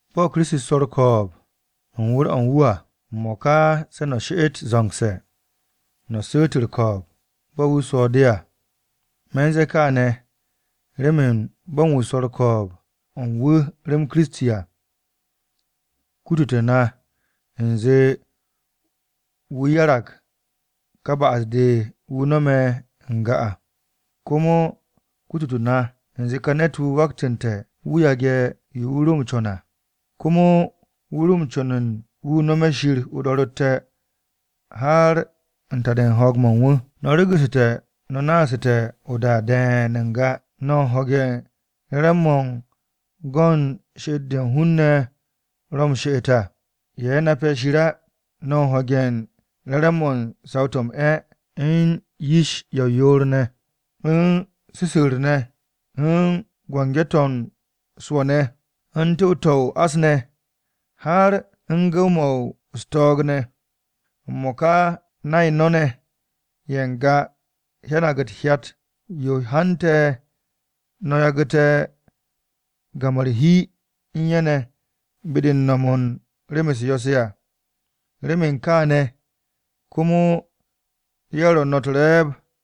Bo̱ Kiristi swo̱ u̱r-ko̱o̱b u̱n wu̱r-o̱ u̱n wu̱ à, m-mo̱ka se̱ no̱ she'et zo̱ngse̱ no̱ su̱u̱t u̱r-ko̱o̱b bo̱ wu̱ swo̱ de à. Me̱ u̱n ze̱e̱ kaane̱ remen bo̱ u̱n wu̱ swo̱ u̱r-ko̱o̱b u̱n wu̱r-o̱ u̱n wu̱ rem Kiristi à, kutute̱ na u̱nze wu̱ 'yarag ka ba'as-de wu̱ no̱me̱ n-ga à. Komo kutute̱ na u̱nze ka ne̱t-wu̱ waktu̱nte̱ wu̱ yage̱ yo wu̱ ro m-co̱n à, komo wu̱ ro̱ m-co̱n wu̱ nome̱ Shir o-do̱ro̱tte̱ har u̱n ta-de u̱n ho̱o̱g-mo̱ u̱n wu̱. No̱ regu̱ssu̱te̱ no̱ naasu̱te̱ o-da de̱e̱n n-ga, no̱ u̱n ho̱ge̱ u̱n re̱re̱m-mo̱ u̱n go̱ u̱n she'et-de hun-ne̱ ro̱ m-she'et à ye̱ nape̱ Shir á. No̱ u̱n ho̱ge̱ u̱n re̱re̱m-mo̱ u̱n saw-to̱ m-'e̱, u̱n yish-ye̱ ye̱ o-yoor ne̱, u̱n su̱su̱u̱r ne̱, u̱n biki-to̱ m-swo̱ ne̱, u̱n tu̱w-to̱ o-ás ne̱, har u̱n gu̱w-mo̱ u̱s-to̱o̱g ne̱. M-mo̱ka nay no̱ ne̱ ye̱ n-ga hyanag u̱t-hyat yo hante̱ no̱ yagu̱te̱ gam-o̱ u̱r-hi u̱n ye̱ ne̱ be-de u̱n no̱m u̱n rem-u̱s yo̱-se à. Remen kááne̱ komo ye̱ ro̱ no̱ u̱t-re̱e̱b.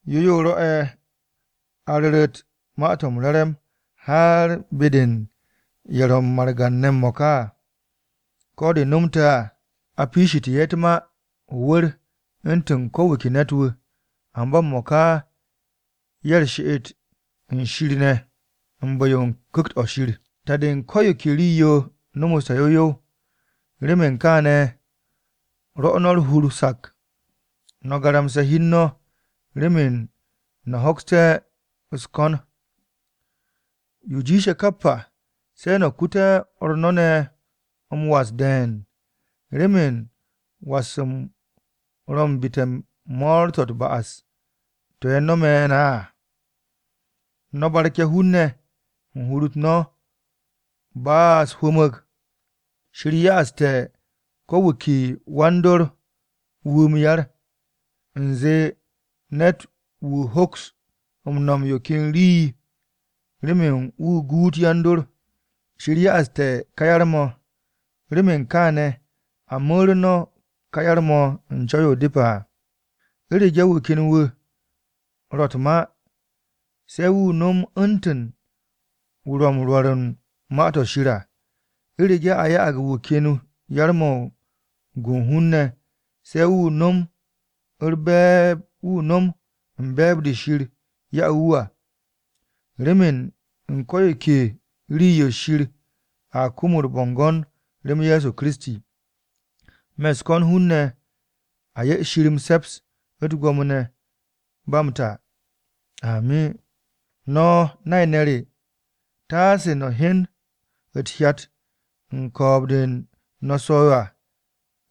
Yo yo rwo̱'e̱ a ru̱ru̱t Ma-to̱ m-Re̱re̱m har be-de u̱n ye̱ ro̱ margan-ne̱ m-mo̱ka à. Ko̱ de nomte̱ à a piishitu̱ ye̱ u̱t-ma o-wu̱r u̱ntu̱n ko wu̱ ke ne̱t-wu̱, amba m-mo̱ka ye̱ u̱r-she'et u̱n Shir ne̱ u̱n bu̱-yo u̱n Ku̱kt-o̱ Shir. Ta-de u̱n ko̱ yo ke rii-yo nomoste̱ yow yow. Remen kaane̱ rwo̱ no̱ u̱r-hur sak, no̱ garamse̱ hi u̱n no̱ remen no̱ hoksté̱ u̱s-ko̱n. Yo jiishe̱ kap à, se̱ no̱ kute̱ o̱r no̱ ne̱ m-was de̱e̱n, remen was-m ro̱ u̱n bite̱ mo̱o̱r-to̱ u̱t-ba'as to̱ ye̱ no̱me̱ na à. No̱ barke̱ hun-ne̱ u̱n hur-u̱t no̱ ba u̱s-hwu̱mu̱g. Shir ya'ag ko̱ wu̱ ke wan-dor wu̱ m-yar, u̱nze ne̱t-wu̱ hoks m-no̱m yo ken rii-yo remen wu̱ guut yan-dor. Shir ya'ag ká yar-mo̱, remen kaane̱ a mu̱re̱ no̱ ká yar-mo̱ u̱n co̱w-yo depe̱ à. U̱rege̱ wu̱ ken wu̱ ro̱ u̱t-ma, se̱ wu̱ nom u̱ntu̱n wu̱ ro̱ m-rwo̱r u̱n Ma-to̱ Shir à. U̱rege̱ a ya'ag wu̱ ken yar-mo̱ u̱n gu u̱n hun-ne̱, se̱ wu̱ nom u̱n be̱e̱b-de Shir ya'u̱ wu̱ à. Remen u̱n ko̱ yo ke rii-yo Shir a kum u̱r-bo̱ngo̱n rem Ye̱so Kiristi. Me̱ u̱s-ko̱n hun-ne̱ a 'ye Shir m-se̱ps, u̱t-gwo̱mo ne̱, ba m-ta. Amin. No̱ nay-ne̱ re, taase no̱ hyen u̱t-hyat u̱n ko̱o̱b-de no̱ m-swo̱ à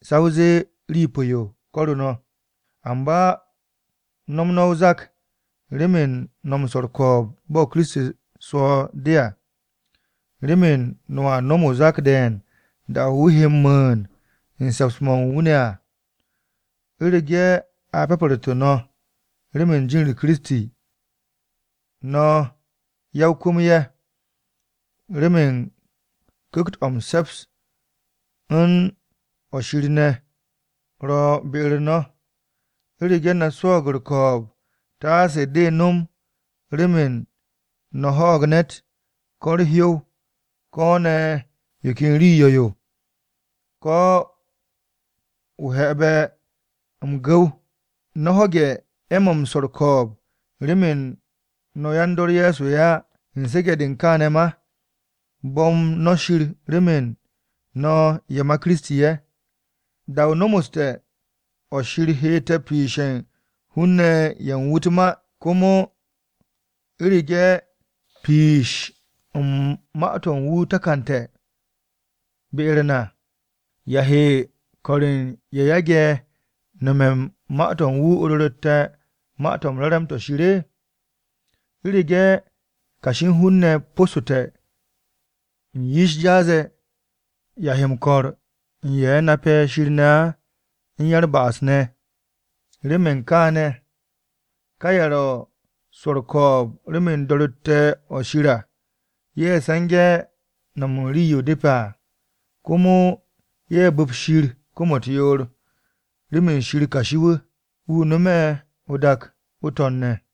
sa o zee rii pu̱-yo ko̱ru̱ no̱. Amba no̱m no̱ o-zak, remen no̱ m-swo̱ u̱r-ko̱o̱b bo̱ Kiristi swo̱ de à. Remen no̱a nom o-zak de̱e̱n da-o̱ wu̱ he m-mu̱u̱n u̱n se̱ps-mo̱ u̱n wu̱ ne̱ à. U̱rege̱ a pyapu̱rtu̱ no̱ remen jin-u̱r Kiristi, no̱ ya-o-kwu̱m-ye̱, remen Ku̱kt-o̱ m-se̱ps, u̱n o̱ Shir ne̱ ro̱ be-u̱r no̱. U̱rege̱ no̱ swo̱o̱g u̱r-ko̱o̱b, taase de nom remen no̱ ho̱o̱g ne̱t, ko̱ u̱r-hyow, ko̱ ne̱ yo ken rii yo̱-yo, ko̱ o-he̱be̱ gwu̱w. No̱ ho̱ge̱ 'e̱-mo̱ u̱n swo̱ u̱r-ko̱o̱b remen no̱ yan-dor Ye̱so á. U̱n su̱ge̱-de u̱n kaane̱ ma, bo̱m no̱ Shir remen no̱ ye̱ ma Kiristi ye̱. Da-o nomoste̱ o̱ Shir hette̱ piishe̱ u̱n hun-ne̱ ye̱ u̱n wu̱ u̱t-ma à. Komo u̱rege̱ piish u̱n ma-to̱ u̱n wu̱ takante̱ be-u̱r na. ¿Ya he ko̱r u̱n ye̱ yage̱ nome̱ u̱n ma-to̱ u̱n wu̱ o-do̱ro̱tte̱ Ma-to̱ m-Re̱re̱m to̱ Shir? “U̱rege̱ kashi u̱n hun-ne̱ po̱ssu̱te̱ u̱n yish jaas-ye̱, ¿ya he m-ko̱r u̱n ye̱ nape̱ Shir ne̱ á u̱n ya-u̱r-ba'as ne̱?” Remen kaane̱, ka ye̱ ro̱ u̱n swo̱ u̱r-ko̱o̱b remen do̱ro̱tte̱-o̱ Shir à, ye̱ se̱nge̱ no̱m u̱n rii-yo depe̱ à. Komo ye̱ bu̱p Shir kom-u̱t yoor, remen Shir kashi-wu̱, wu̱ no̱me̱ o-dak o-To̱n ne̱.